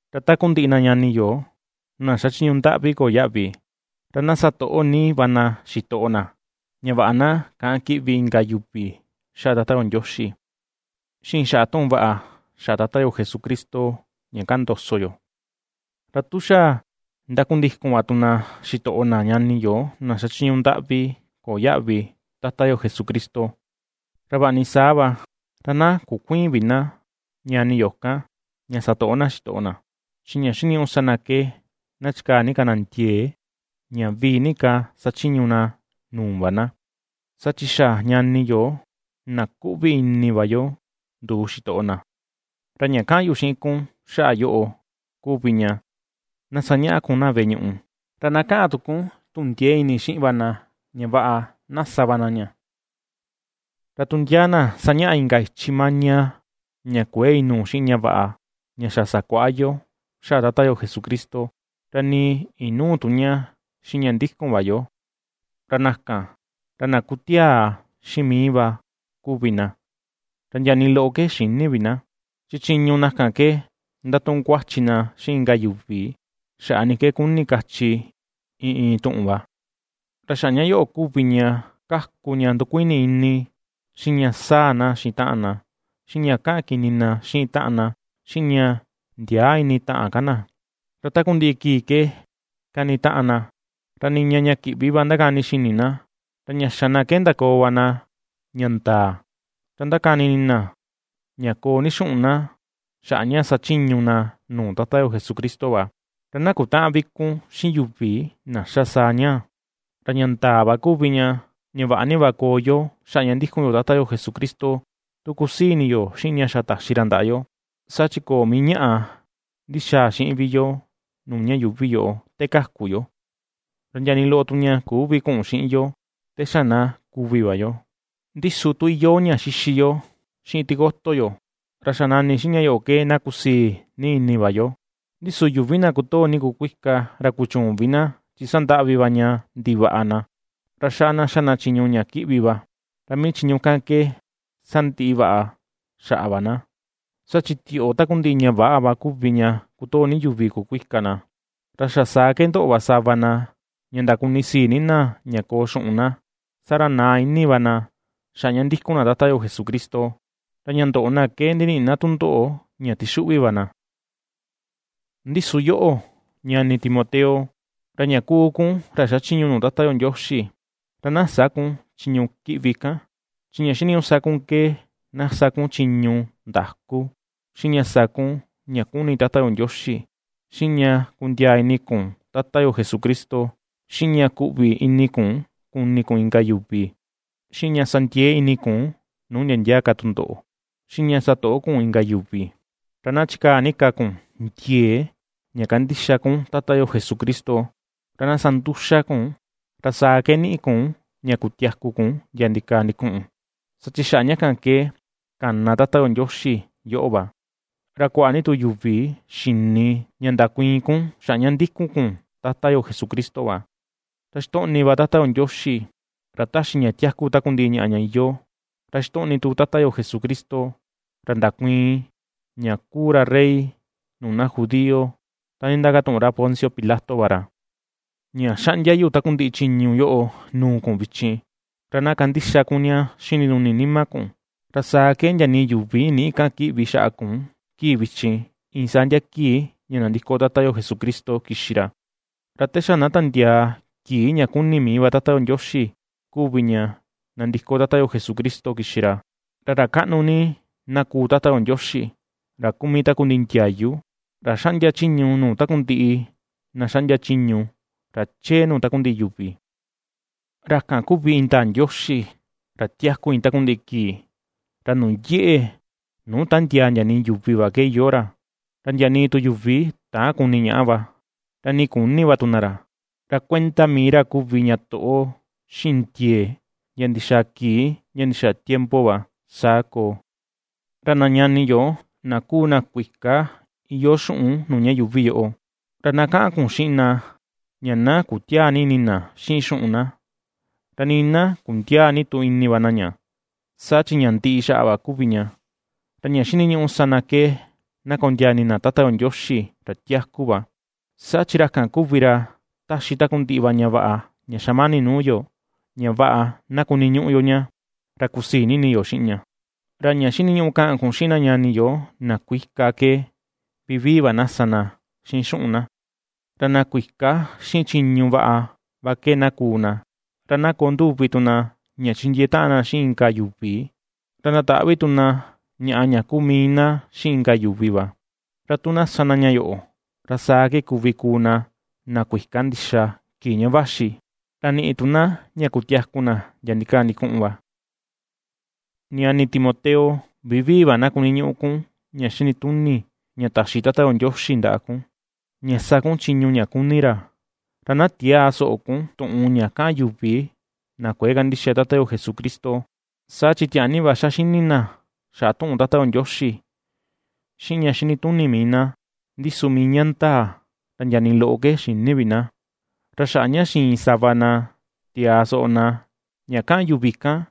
Ra takundiꞌi na ñani yo, na xachiñu ndaꞌvi köo yaꞌvi, ra na satoꞌo ni va na xitoꞌo na, ña vaꞌa na käꞌan kiꞌvi inka yuvi xaꞌa Tata yo Ndioxi, xiꞌin xaꞌa tuꞌun vaꞌa xaꞌa Tata yo Jesucristo ña kaꞌan ndoso yo. Ra tu xa ndakundikun va tu na xitoꞌo na ñani yo na xachiñu ndaꞌvi köo yaꞌvi Tata yo Jesucristo, ra vaꞌa ni saa va ra na kukuïin vi na ñani yo kan, ña satoꞌo na xitoꞌo na, chi ña xiniñuꞌu sa na ke na chikaa ni ka na ndiee ña vii ni ka sachiñu na nuu va na; saa chi xa ñani yo na kuꞌvi ini va yo nduu xitoꞌo na. Ra ña kaꞌan yu xiꞌin kun xaꞌa yoꞌo kuvi ña na ^sañaꞌa kun na veꞌe ñuꞌu, ra na kaꞌan tu kun tuꞌun ndieé ini xiꞌin va na ña vaꞌa na sa va na ña. Ra tu ndia na sañaꞌa inka ichi maña, ña kuëe inuu xiꞌin ña vaꞌa ña xa sakuaꞌa yo xaꞌa Tata yo Jesucristo, ra nii inüu tu ña xiꞌin ña ndikun va yo, ra na kan, ra na kutiaa xiꞌin mii va kuvi na, ra ndia nii loꞌo ke xïni vi na. Chi chiñu na kan ke ndatuꞌun kuachi na xiꞌin inka yuvi xaꞌa ni ke kuni kachi iin iin tuꞌun va; ra xaꞌa ña yoꞌo kuvi ña ^kaku ña ndukuini ini, xiꞌin ña saa na xiꞌin taꞌan na, xiꞌin ña kaꞌan kini na xiꞌin taꞌan na, xiꞌin ña ndiäa ini taꞌan ka na. Ra takundiꞌi kii ke kanitaꞌan na, ra niña ña kiꞌvi va ndakani xini na, ra ña xa na ke ndakoo va na ña ndaa, ra ndakani ini na ña koo ni xuꞌun na xaꞌa ña sachiñu na nuu Tata yo Jesucristo va. Ra na kutäꞌan vi kun xiꞌin yuvi na xa sa ñaa. Ra ña ndaa va kuvi ña, ña vaꞌa ni va koo yo xaꞌa ña ndikun yo Tata yo Jesucristo, tu kusii ini yo xiꞌin ña xa taxi ra ndaꞌa yo. Saa chi köo mii ñaꞌa ndixaa xiꞌin vi yo nuu ña yuuvi yoꞌo te kaku yo, ra ndia nii loꞌo tu ña küvi kuꞌun xiꞌin yo te xa na kuvi va yo; ndi su tu iyoo ña ^xixi yo, xiꞌin tikoto yo, ra xa nani xiꞌin ña yoꞌo ke na kusii ni ini va yo. Ndi su yuvi na kotoo ni kukuika, ra kuchüun vi na, chi ^sandaꞌvi va ña ndivaꞌa na. Ra xaꞌa na ^xa na chiñu ña kiꞌvi va, ra mii chiñu kan ke sandiꞌi vaꞌa xaꞌa va na. Saa chi tioꞌo takundiꞌi ña väꞌa va kuvi ña kotoo ni yuvi kukuika na; ra xa saa ke ndoꞌo va sava na ña ndakunisii ni na ña koo xuꞌun na, saa ra naa ini va na xaꞌa ña ndikun na Tata yo Jesucristo, ra ña ndoꞌo na ke ndiniꞌi na tundoꞌo, ña ^tixuꞌvi va na. Ndi su yoꞌo, ñani Timoteo, ra ña kuu kun ra xachiñu nuu Tata yo Ndioxi, ra na sä kun chiñu kiꞌvi kan. Chi ña xiniñuꞌu sa kun ke na sa kun chiñu ndaku, xiꞌin ña sa kun ña kuni Tata yo Ndioxi, xiꞌin ña kundiaa ini kun Tata yo Jesucristo, xiꞌin ña kuꞌvi ini kun kuni kun inka yuvi, xiꞌin ña sa ndiee ini kun nuu ndia ndia ka tundoꞌo, xiꞌin ña satoꞌo kun inka yuvi. Ra na chikaa ni ka kun ndiee ña kandixa kun Tata yo Jesucristo; ra na sa nduxa kun, ra saa ke niꞌi kun ña kutiaku kun ndia ndikaa ndikuꞌun, saa chi xaꞌa ña kan ke kana Tata yo Ndioxi yoꞌo va, ra kuaꞌa ni tu yuvi xini ña ndakuiin kun xaꞌa ña ndikun kun Tata yo Jesucristo va. Ra ^xitoꞌni va Tata yo Ndioxi, ra ^taxi ña tiaku takundiꞌi ñaꞌa ña iyoo, ra xitoꞌni tu Tata yo Jesucristo, ra ndakuiin ña kuu ra rey nuu na judío ta nditakatuꞌun ra Poncio Pilato va ra, ña ^xaꞌndia yu takundiꞌi chiñu yoꞌo nuu kun vichin, ra na kandixa kun ña xiꞌin ndinuni nima kun, ra saa ke ndia nii yuvi nïꞌi kaꞌan kiꞌvi xaꞌa kun kii vichin, iin saa ndia kii ña nandiko Tata yo Jesucristo kixi ra, ra te xa na tandiaa kii ña ^kuni mii va Tata yo Ndioxi kuvi ña nandiko Tata yo Jesucristo kixi ra. Ra ra kaꞌnu ni na kuu Tata yo Ndioxi, ra kuu mii takundiꞌi ndiayu, ra ^xaꞌndia chiñu nuu takundiꞌi na ^xaꞌndia chiñu, ra chee nuu takundiꞌi yuvi. Ra kan kuvi indaa Ndioxi, ra tiaku iin takundiꞌi kii, ra nuu yeꞌe, nuu tändiaa ndia nii yuvi va ke iyoo ra. Ra ndia nii tu yuvi täan kuni ñaꞌa va, ra nii küni va tu na ra. ¡Ra kuenda mii ra kuvi ña toꞌo, xiꞌin ndiee ndia ndixaa kii ndia ndixaa tiempo va! Saa koo. Ra na ñani yo, na kuu na kuika iyoo xuꞌun nuu ña yuuvi yoꞌo, ra na kaꞌan kun xiꞌin na ña na kutiäa ni ini na xiꞌin xuꞌun na, ra nii na kundiäa ni tu ini va na ña, saa chi ña ndiꞌi xaꞌa va kuvi ña. Ra ña xiniñuꞌu sa na ke na kondiaa ini na Tata yo Ndioxi ra tiaku va, saa chi ra kan kuvi ra ^taxi takundiꞌi va ñaꞌa ña xamani nuu yo ña vaꞌa na kuniñuꞌu yo ña, ra kusii ni ini yo xiꞌin ña. Ra ña xiniñuꞌu kaꞌan kun xiꞌin na ñani yo na kuika ke vivii va na sa na xiꞌin xuꞌun na, ra na kuika xiꞌin chiñu vaꞌa va ke na kuu na, ra na koo nduvi tu na ña chindiee taꞌan na xiꞌin inka yuvi, ra ndataꞌvi tu na ñaꞌa ña kuu mii na xiꞌin inka yuvi va. Ra tu na sa na ña yoꞌo, ra saa ke kuvi kuu na, na kuika ndixa kii ña vaxi, ra niꞌi tu na ña kutiaku na ndia ndikaa ndikuꞌun va. Ñani Timoteo, vivii va na kuniñuꞌu kun ña xinituni, ña taxi Tata yo Ndioxi ndaꞌa kun, ña sa kun chiñu ña kuni ra. Ra na tiäa soꞌo kun tuꞌun ña kaꞌan yuvi na kuëe kandixa Tata yo Jesucristo, saa chi tiaa ni va xa xini na xaꞌa tuꞌun Tata yo Ndioxi xiꞌin ña xinituni mii na, ndi su mii ña ndaa, ra ndia nii loꞌo ke xïni vi na; ra xaꞌa ña xiin sava na tiaa soꞌo ña kaꞌan yuvi kan,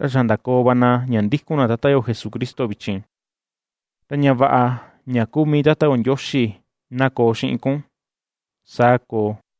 ra xa ndakoo va na ña ndikun na Tata yo Jesucristo vichin. Ra ña vaꞌa ña kuu mii Tata yo Ndioxi na koo xiꞌin kun. Saa koo.